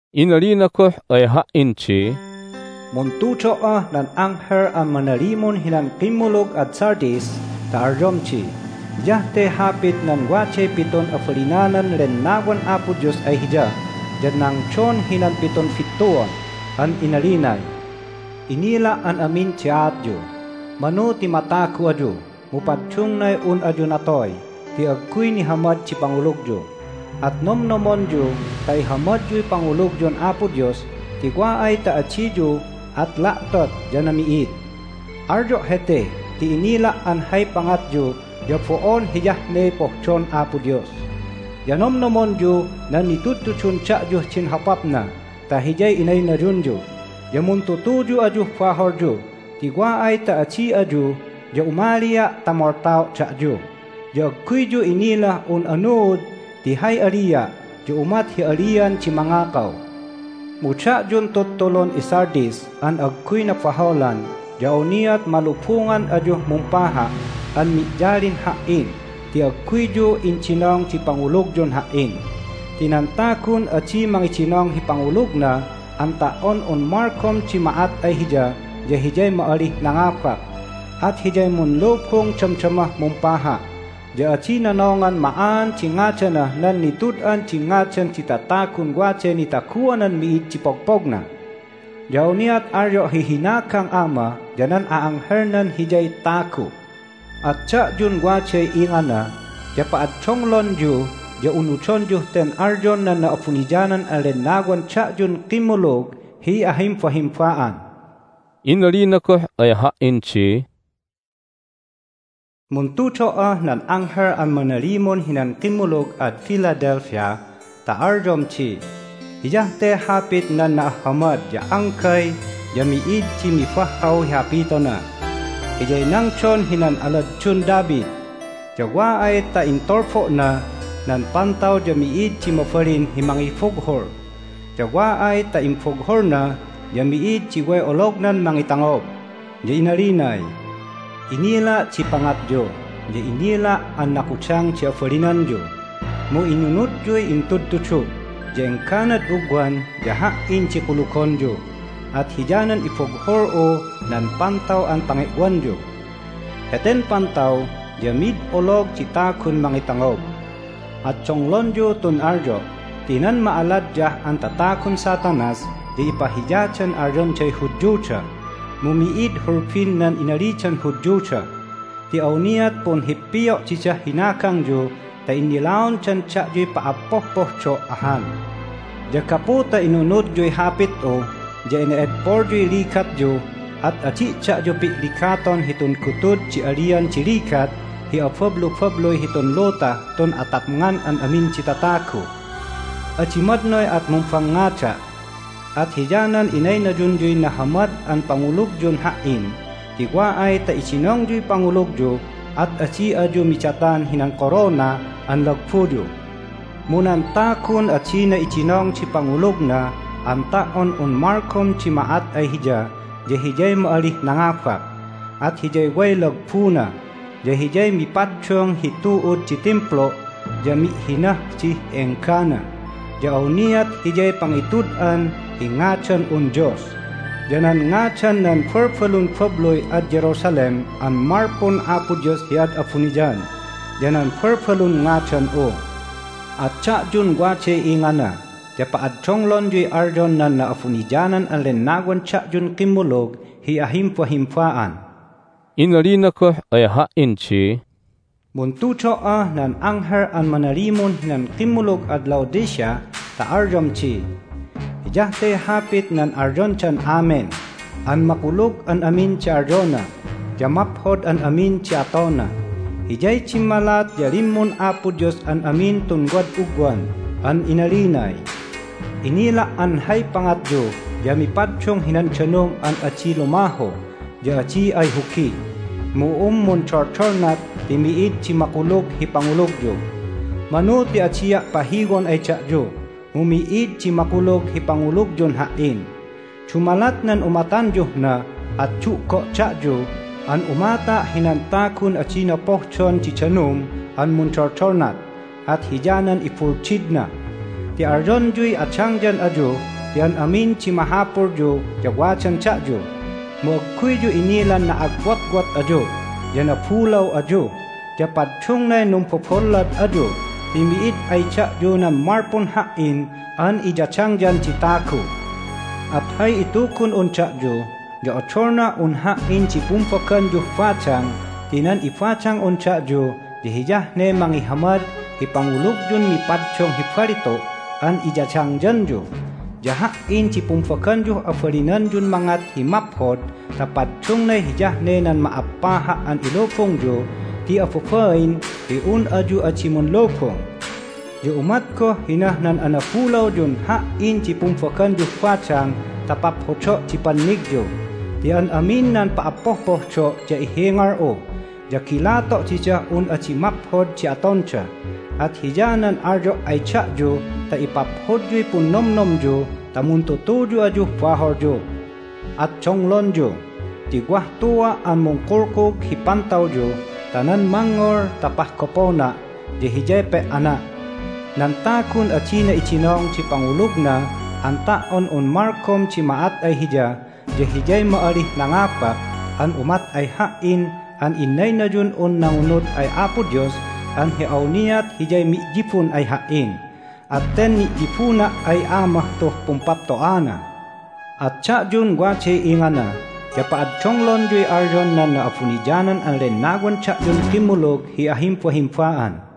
Inalina goh ay ha"in di, "Muntudo"ah nan anghel an manalimun hinan kimmulug ad Sardis ta alyom di: Hiyah te hapit nan waday pitun abalinanan Lennawan Apo Dios ay Hiya ya nangdon hinan pitun bittuan. An inalinay, Inila' an amin di aatyu. Manu ti matagu ayu, mu paddungnay un ayu natoy ti agguy nihamad di pangulugyu. At nomnomonyu ta ihamadyuy pangulugyun Apo Dios ti wa ay ta adiyu at la'tot ya nami'id. Alyo' hete ti inila' an hay pangatyu ya bo'on hiyah ne pohdon Apo Dios. Ya nomnomonyu nan nitudtudun da'yuh din hopapna ta hiyay inaynayunyu, ya muntutuyu ayuh baholyu ti wa ay ta adi ayu ya umalia' ta moltao' da'yu, ya agguyyu inilah un anuud ti hay alia' ya umat hi alian di mangakaw. Mu da'yun tuttulun iSardis an agguy nabaholan ya awniat malubungan ayuh mumpaha' an mi'yalin Ha"in ti agguyyu indinong di pangulugyun Ha"in. Ti nan tagun adi mangidinong hi pangulugna an ta"on un malgom di ma'at ay hiya ya hiyay ma'alih nangabak, at hiyay munlubung damdamah mumpaha', ya adi nonongan ma'aan di ngadanah nan Nitud'an di Ngadan di Tatagun Waday Nitaguanan Mi'id di Pogpogna. Ya awniat alyo' hi hinagang Ama ya nan a'anghelnan hiyay tagu'. At da'yun waday ingana ya pa'addonglonyu ya unudonyuh ten alyon nan Na'abuniyanan an Lennawan da'yun kimmulug hi ahimbahimba'an!" Inalina goh ay ha"in di, "Muntudo"ah nan anghel an manalimun hinan kimmulug ad Philadelphia ta alyom di: Hiyah te hapit nan na'ahhamad ya anggay ya mi'id di mibahhaw hi hapitona. Hiyay nangdon hinan aladdun David, ya wa ay ta intulbo'na nan pantaw ya mi'id di mabalin hi mangibughul. Ya wa ay ta imbughulna ya mi'id di way olognan mangitangob. Ya inalinay, Inila' di pangatyu, ya inila' an nakudang di abalinanyu, mu inunudyuy intudtudu', ya engganad ugwan ya Ha"in di kulugonyu, at hiyanan ibughul'u nan pantaw an pange'wanyu. Heten pantaw ya mid olog di tagun mangitangob. At donglonyu tun alyo' ti nan ma'aladyah an tatagun Satanas ya ipahiyadan alyonday Hudyuda, mu mi'id hulbin nan inalidan Hudyuda. Ti awniat punhippio' didah hinagangyu ta innilaondan da'yuy pa'appohpohdo' ahan. Ya gapu ta inunudyuy hapit'u ya ene'edpolyuy ligatyu at adi' da'yu pi'ligaton hitun gutud di alian di ligat hi abablubabluy hitun lutah tun atapngan an amin di tatagu. Adi madnoy at mumbangngada', at hiyanan inaynayunyuy nahamad an pangulugyun Ha"in ti wa ay ta idinongyuy pangulugyu at adi ayu midatan hinan korona an lagbuyu. Mu nan tagun adina idinong di pangulugna an ta"on un malgom di ma'at ay hiya ya hiyay ma'alih nangabak, at hiyay way lagbuna, ya hiyay mipaddung hi tu'ud di Timplu'. Ya mi'hinah dih enggana. Ya awniat hiyay pangitud'an hi ngadan'un Dios, ya nan ngadan nan balbalun babluy ad Jerusalem an malpun Apo Dios hi ad abuniyan, ya nan balbalun ngadan'u. At da'yun waday ingana ya pa'addonglonyuy alyon nan Na'abuniyanan an Lennawan da'yun kimmulug hi ahimbahimba'an!" Inalina goh ay ha"in di, "Muntudo"ah nan anghel an manalimun hinan kimmulug ad Laodicea ta alyom di: Hiyah te hapit nan alyondan Amen an makulug an amin di alyona, ya maphod an amin di atona. Hiyay dimmalat ya limmun Apo Dios an amin tun wad ugwan. An inalinay, Inila' an hay pangatyu ya mipaddung hinan danum an adi lumahu ya adi ayhugi, mu un mundoldolnat ti mi'id di makulug hi pangulugyu. Manu ti adia' pahiwon ay da'yu, mu mi'id di makulug hi pangulugyun Ha"in. Dumalat nan umatanyuh na at du'go' da'yu an umata' hinan tagun adina pohdon di danum an mundoldolnat, at hiyanan ibuldidna. Ti alyonyuy adangyan ayu ti an amin di mahapulyu ya wadan da'yu. Mu agguyyu inilan na'agwotwot ayu, ya nabulaw ayu, ya paddungnay numbobollad ayu ti mi'id ay da'yu nan malpun Ha"in an iyadangyan di tagu! At hay itugun'un da'yu ya odolnah un Ha"in di pumbaganyuh badang ti nan ibadang'un da'yu ya hiyah ne mangihamad hi pangulugyun mipaddung hi balitu' an iyadangyanyu. Ya Ha"in di pumbaganyuh abalinanyun mangat hi maphod ta paddungnay hiyah ne nan ma'appaha' an ilubungyu ti ababain hi un ayu adi munlubung. Ya umat goh hinah nan anabulawyun Ha"in di pumbaganyuh badang ta paphodo' di pannigyu. Ti an amin nan pa'appohpohdo' ya ihingal'u, ya gilato' didah un adi maphod di atonda. At hiyanan alyo' ay da'yu ta ipaphodyuy punnomnomyu ta muntutuyu ayuh baholyu. At donglonyu! Ti wah tua' an mungkulkug hi pantawyu ta nan mangngol ta pahgopona' ya hiyay pe"ana'. Nan tagun adina idinong di pangulugna an ta"on un malgom di ma'at ay hiya ya hiyay ma'alih nangabak an umat ay Ha"in an innaynayun'un nangunud ay Apo Dios an hi awniat hiyay mi'yibun ay Ha"in, at ten ni'yibuna' ay Amah tuh pumpapto'ana. At da'yun waday ingana ya pa'addonglonyuy alyon nan Na'abuniyanan an Lennawan da'yun kimmulug hi ahimbahimba'an!"